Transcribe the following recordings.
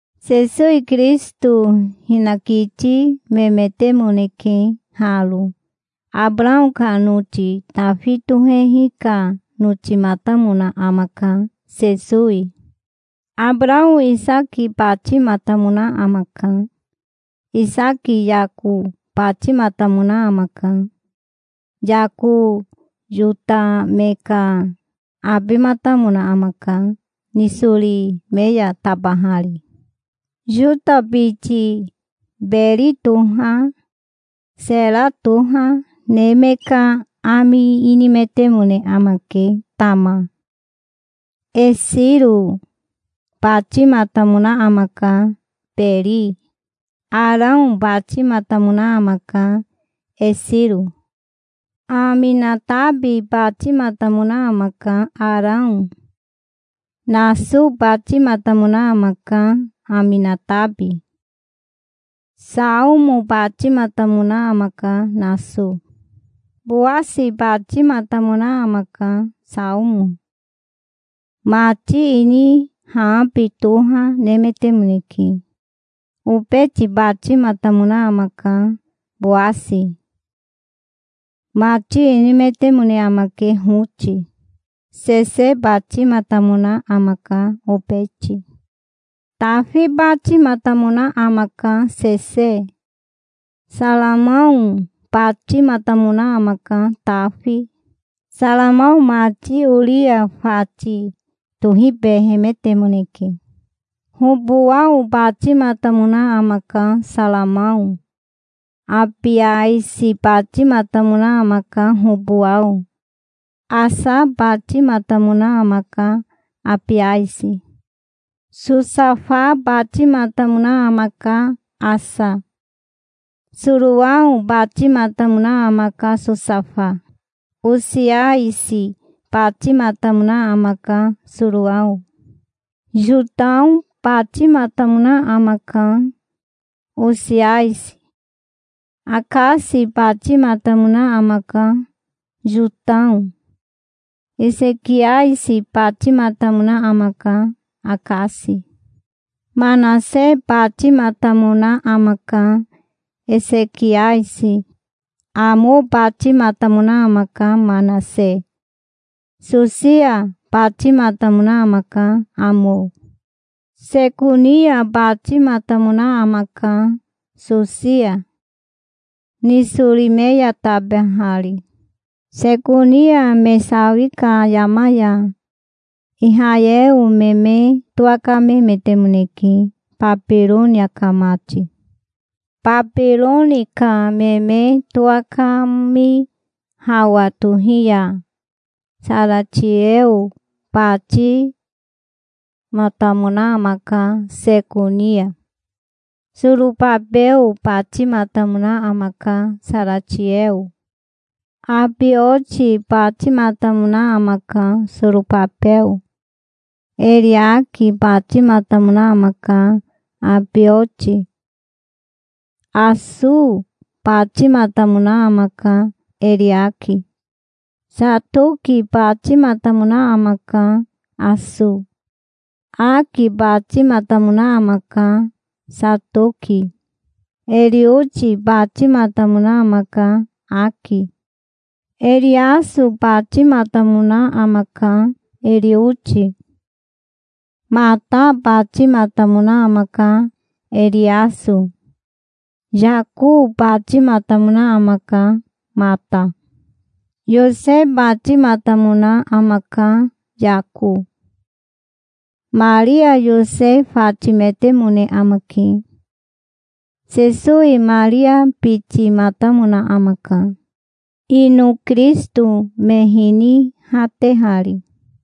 Sesowi Kirisito hinakiti memetemoneke haro. Abarao ka noti Tafi tohehi ka notimatamona amaka, Sesowi. Abarao Isaki batimatamona amaka. Isaki Yako batimatamona amaka. Yako Yota me ka abimatamona amaka, nisori me ya tabahari. Yota biti Beri toha Sera toha ne me ka ami inimetemone amake Tama. Esiro batimatamona amaka Beri. Arao batimatamona amaka Esiro. Aminatabi batimatamona amaka Arao. Naso batimatamona amaka Aminatabi. Saomo batimatamona amaka Naso. Bowasi batimatamona amaka Saomo. Mati ini Haabi toha nemetemoneke. Obeti batimatamona amaka, Bowasi. Mati inimetemone amake Hoti. Sese batimatamona amaka Obeti. Tafi batimatamona amaka Sese. Saromao batimatamona amaka Tafi. Saromao mati Oria fati tohibehemetemoneke. Hobowao batimatamona amaka Saromao. Abiasi batimatamona amaka Hobowao. Asa batimatamona amaka Abiasi. Sosafa batimatamona amaka Asa. Sorao batimatamona amaka Sosafa. Osiasi batimatamona amaka Sorao. Yotao batimatamona amaka Osiasi. Akasi batimatamona amaka Yotao. Esekiasi batimatamona amaka Akasi. Manase batimatamona amaka Esekiasi. Amo batimatamona amaka Manase. Sosia batimatamona amaka Amo. Sekonia batimatamona amaka Sosia, nisori me ya tabahari. Sekonia me sawi ka yama ya Ihayeo me me towakamehemetemoneke Babironia ka mati. Babironia ka me me towakami hawa tohi ya Saratieo batimatamona amaka Sekonia. Sorobabeo batimatamona amaka Saratieo. Abioti batimatamona amaka Sorobabeo. Eriaki batimatamona amaka Abioti. Aso batimatamona amaka Eriaki. Satoki batimatamona amaka Aso. Aki batimatamona amaka Satoki. Erioti batimatamona amaka Aki. Eriaso batimatamona amaka Erioti. Mata batimatamona amaka Eriaso. Yako batimatamona amaka Mata. Yose batimatamona amaka Yako. Maria Yose fatimetemone amake. Sesowi Maria bitimatamona amaka, ino Kirisito me hinihatehari.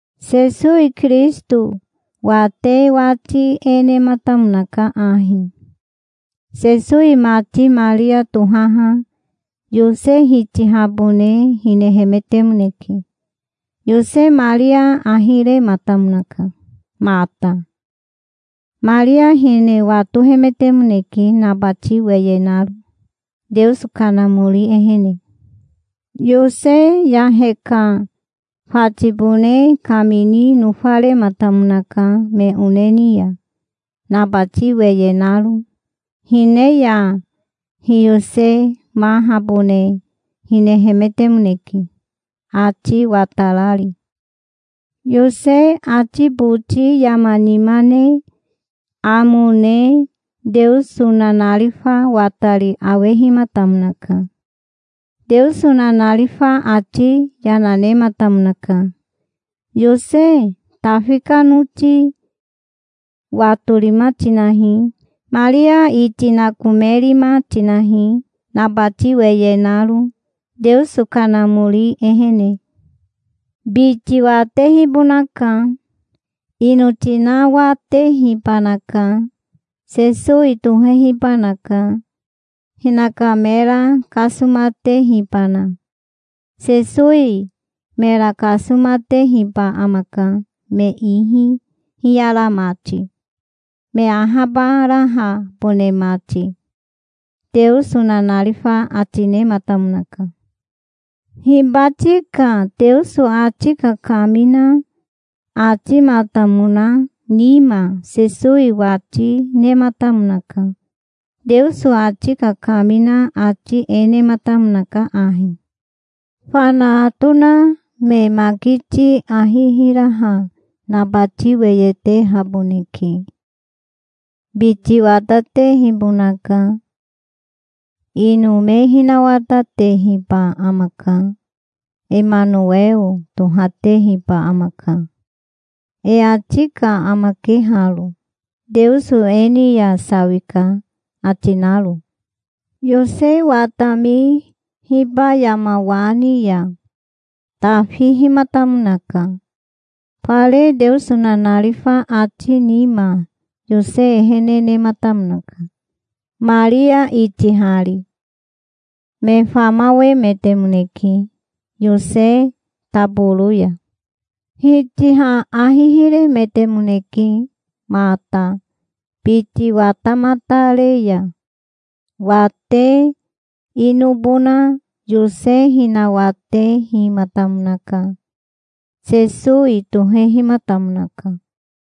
Sesowi Kirisito wate wati e nematamonaka ahi. Sesowi mati Maria tohaha Yose hitihabone hinehemetemoneke. Yose Maria ahi rematamonaka mata. Maria hine watohemetemoneke nabati weye naro, Teoso Kanamori ehene. Yose yahe ka fatibone kamini nofarematamonaka me one ni ya, nabati weye naro. Hine ya hiyosemahabone hinehemetemoneke, ati watarari. Yose ati boti yama nima ne amo ne Teoso nanarifa watari awehimatamonaka. Teoso nanarifa ati yana nematamonaka. "Yose Tafi ka noti watorima tinahi. Maria iti nakomerima tinahi, nabati weye naro Teoso Kanamori ehene. Biti watehibonaka. Ino tinawatehibanaka. Sesowi tohehibanaka, hinaka mera kasomatehibana. Sesowi mera kasomatehiba amaka me ihi hiyara mati, me ahabarahabone mati", Teoso nanarifa ati nematamonaka. Hibati ka Teoso ati kakamina atimatamona nima Sesowi wati nematamonaka. Teoso ati kakamina ati e nematamonaka ahi: "Fana atona me makiti ahi hiraha nabati weye tehaboneke. Biti watatehibonaka. Ino me hinawatatehiba amaka. Emanoweo tohatehiba amaka. E ati ka amake haro, Teoso e ni ya sawika ati naro". Yose watami hiba yama wa ni ya tafihimatamonaka. Fare Teoso nanarifa ati nima Yose ehene nematamonaka, Maria itihari. Me famawemetemoneke Yose taboro ya. Hitiha ahi hirehemetemoneke mata biti watamatare ya. Wate inobona Yose hinawatehimatamonaka. Sesowi tohehimatamonaka.